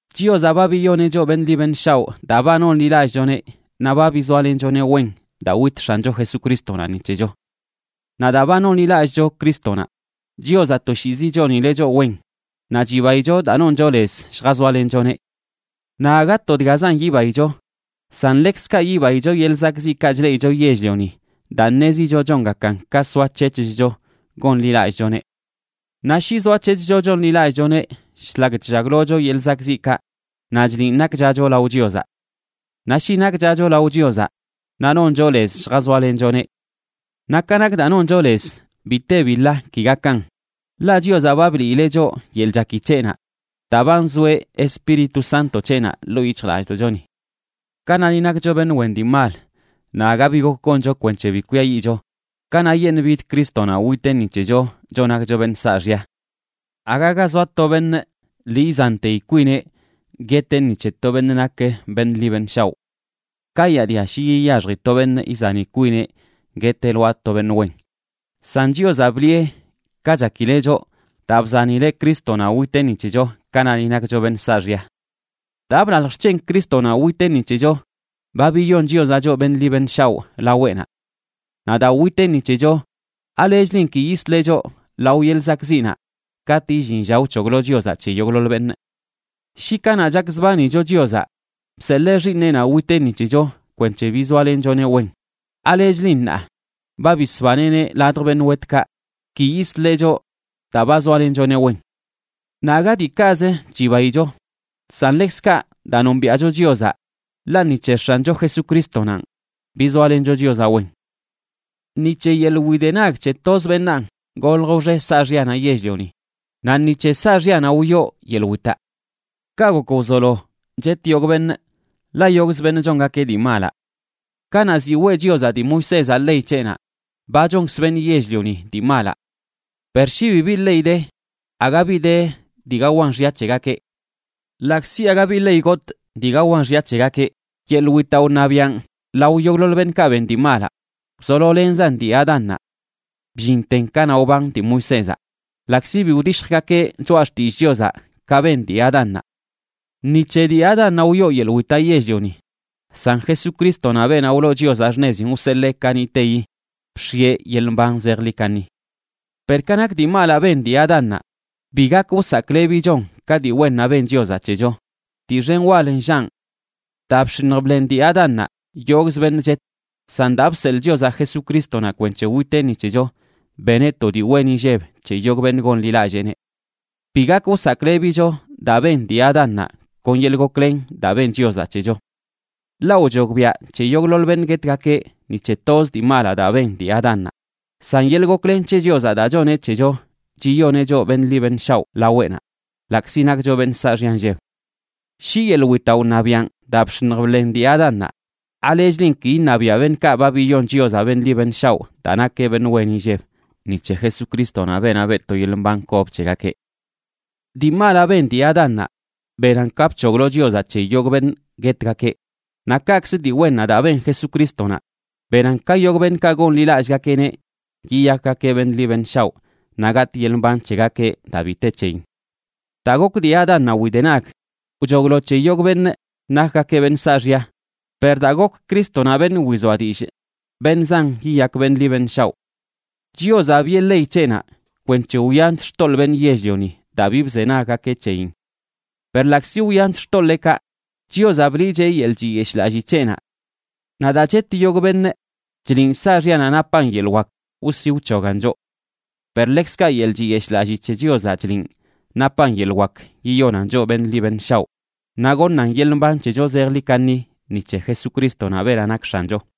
Chiozaꞌ ba biyoneꞌ choꞌ beṉꞌ ḻi beṉꞌ shaoꞌ daa ba nonḻilallꞌchoneꞌ, naꞌ ba bizoalenchoneꞌ wen daa wit X̱ancho Jesucrístonaꞌ ni c̱hecho. Naꞌ daa ba nonḻilallꞌcho Crístonaꞌ, Chiozaꞌ toshiizi chonileꞌ choꞌ wen naꞌ chibaicho daa noncho lez lljazoalenchoneꞌ. Naꞌ aga to dgazan yibaicho, san ḻekzkaꞌ yibaicho yeḻꞌ zakꞌziꞌkaꞌ chleꞌicho yell-lioni, daa ṉezicho chongakan ka soac̱hec̱hcho gonḻilallꞌchoneꞌ. Naꞌ shi zoac̱hec̱hcho chonḻilallꞌchoneꞌ shlak chllaglocho yeḻꞌ zakꞌziꞌkaꞌ, naꞌ chliꞌn nakchacho lao Chiozaꞌ. Naꞌ shi nakchacho lao Chiozaꞌ naꞌ noncho lez lljazoalenchoneꞌ. Naꞌ ka nak daa noncho lez, bi te bi ḻa ki gakan, ḻaꞌ Chiozaꞌ ba bliileꞌ choꞌ yeḻꞌ chaki c̱heꞌnaꞌ daa ba nzoeꞌ Espíritu Santo c̱heꞌnaꞌ ḻoo yic̱hjlallꞌdoꞌchoni. Kanaꞌ ni nakcho beṉꞌ wen dii mal naꞌ aga bi gok goncho kwenc̱he bi kwiayiꞌcho, kanaꞌyeṉꞌ bid Crístonaꞌ witeꞌ ni c̱hecho choꞌ nakcho beṉꞌ saaxya. Aga ga zoa to beṉꞌ lii izanteyi kwineꞌ gueteꞌ ni c̱he to beṉꞌ nak beṉꞌ ḻi beṉꞌ shaoꞌ. Kayaadia shi yiyaxji to beṉꞌ izani kwineꞌ gueteꞌ lwaa to beṉꞌ wen. San Chiozaꞌ bliꞌe ka chakileꞌ choꞌ daa bzanileꞌ Crístonaꞌ witeꞌ ni c̱hecho kanaꞌ ni nakcho beṉꞌ saaxya. Daa blalj xc̱hen Crístonaꞌ witeꞌ ni c̱hecho, ba biyon Chiozaꞌ choꞌ beṉꞌ ḻi beṉꞌ shaoꞌ laweꞌnaꞌ. Naꞌ daa witeꞌ ni c̱hecho, ¿alechlin ki yisleꞌ choꞌ lao yeḻꞌ zakꞌziꞌnaꞌ katꞌ illin lla wc̱hoglo Chiozaꞌ c̱he yogꞌḻoḻ beṉꞌ? Shi kanaꞌ chakzbanicho Chiozaꞌ, bseḻee Xiiṉeꞌnaꞌ witeꞌ ni c̱hecho kwenc̱he bizoalenchoneꞌ wen, ¿alechlin ṉaa ba bisbaneꞌneꞌ ladj beṉꞌ wetkaꞌ ki yisleꞌ choꞌ daa ba zoalenchoneꞌ wen? Naꞌ aga diikaꞌz chibaicho, san ḻekzkaꞌ daa nombiaꞌcho Chiozaꞌ, ḻaꞌ ni c̱he X̱ancho Jesucristonanꞌ bizoalencho Chiozaꞌ wen. Ni c̱he yeḻꞌ widenag c̱he toz beṉaan golj wxe saaxyanaꞌ yell-lioni, naꞌ ni c̱he saaxyanaꞌ wyoo yeḻꞌ witaꞌ. Kaꞌ gok wzolo chet yogꞌ beṉꞌ, ḻaꞌ yogꞌzə beṉꞌ chongakeꞌ dii malaꞌ. Kanaꞌ ziꞌ weꞌ Chiozaꞌ dii Moisézaꞌ ley c̱heꞌnaꞌ, ba chonkzə beṉꞌ yell-lioni dii malaꞌ. Per shi bibi ley de, aga bi de dii gawan xya c̱hegakeꞌ. Ḻaꞌkzi aga bi ley gotꞌ dii gawan xya c̱hegakeꞌ, yeḻꞌ witaꞌ wṉabiaꞌn lao yogꞌḻoḻ beṉꞌkaꞌ ben dii malaꞌ wzololenzan dii Adánnaꞌ bllinten kanaꞌ wban dii Moisézaꞌ, ḻaꞌkzi bi wdishjgakeꞌ choꞌa xtillꞌ Chiozaꞌ ka ben dii Adánnaꞌ. Ni c̱he dii Adánnaꞌ wyoo yeḻꞌ witaꞌ yell-lioni, san Jesucrístonaꞌ, beenaꞌ wloo Chiozaꞌ xṉezin wseḻee kaniꞌteyi, bx̱ieꞌ yeḻꞌ mban zejḻi kaṉi. Per ka nak dii malaꞌ ben dii Adánnaꞌ, bi gak wsaklebichon ka dii wennaꞌ ben Chiozaꞌ c̱hecho, dii xen wal nllaꞌn. Daa bx̱iṉj bḻen dii Adánnaꞌ yogꞌzə beṉꞌ chet, san daa bseḻꞌ Chiozaꞌ Jesucrístonaꞌ kwenc̱he witeꞌ ni c̱hecho, beneꞌ to dii wen inlleb c̱he yogꞌ beṉꞌ gonḻilalleeneꞌ. Bi gak wsaklebicho daa ben dii Adánnaꞌ kon yeḻꞌ goklen daa ben Chiozaꞌ c̱hecho. Ḻaꞌ wchogbiaꞌ c̱he yogꞌḻoḻ beṉꞌ guetgakeꞌ ni c̱he toz dii malaꞌ daa ben dii Adánnaꞌ; san yeḻꞌ goklen c̱he Chiozaꞌ daa choneꞌ c̱hecho chiyoneꞌ choꞌ beṉꞌ ḻi beṉꞌ shaoꞌ laweꞌnaꞌ, ḻaꞌkzi nakcho beṉꞌ saaxya nlleb. Shi yeḻꞌ witaꞌ wṉabiaꞌn daa bx̱iṉj bḻen dii Adánnaꞌ, ¿alechlin ki iṉabiaꞌ beṉꞌkaꞌ ba biyon Chiozaꞌ beṉꞌ ḻi beṉꞌ shaoꞌ daa nakeꞌ beṉꞌ wen inlleb, ni c̱he Jesucrístonaꞌ, beenaꞌ beꞌ to yeḻꞌ mban kob c̱hegakeꞌ? Dii malaꞌ ben dii Adánnaꞌ benan ka bc̱hoglo Chiozaꞌ c̱he yogꞌ beṉꞌ guetgakeꞌ, naꞌ kaꞌkzə dii wennaꞌ daa ben Jesucrístonaꞌ benan ka yogꞌ beṉꞌkaꞌ gonḻilallꞌgakeꞌneꞌ yiyakgakeꞌ beṉꞌ ḻi beṉꞌ shaoꞌ naꞌ gatꞌ yeḻꞌ mban c̱hegakeꞌ daa bi te c̱heyin. Daa gok dii Adánnaꞌ widenag, wchoglo c̱he yogꞌ beṉꞌ nakgakeꞌ beṉꞌ saaxya, per daa gok Crístonaꞌ beṉꞌ wizoa dillꞌ, beṉꞌ zan yiyak beṉꞌ ḻi beṉꞌ shaoꞌ. Chiozaꞌ biꞌe ley c̱heꞌnaꞌ kwenc̱he wyanch xtoḻꞌ beṉꞌ yell-lioni daa bi bzenaggakeꞌ c̱heyin. Per ḻaꞌkzi wyanch xtoḻeekaꞌ, Chiozaꞌ bliꞌcheꞌ yeḻꞌ chiyeshꞌlallii c̱heꞌnaꞌ. Naꞌ daa chet yogꞌ beṉꞌ, chliꞌn saaxyanaꞌ napan yeḻꞌ wak wsi wc̱hogan choꞌ. Per ḻekzkaꞌ yeḻꞌ chiyeshꞌlallii c̱he Chiozaꞌ chliꞌn napan yeḻꞌ wak yiyonan choꞌ beṉꞌ ḻi beṉꞌ shaoꞌ naꞌ goṉan yeḻꞌ mban c̱hecho zejḻi kaṉi ni c̱he Jesucrístonaꞌ, beenaꞌ nak X̱ancho.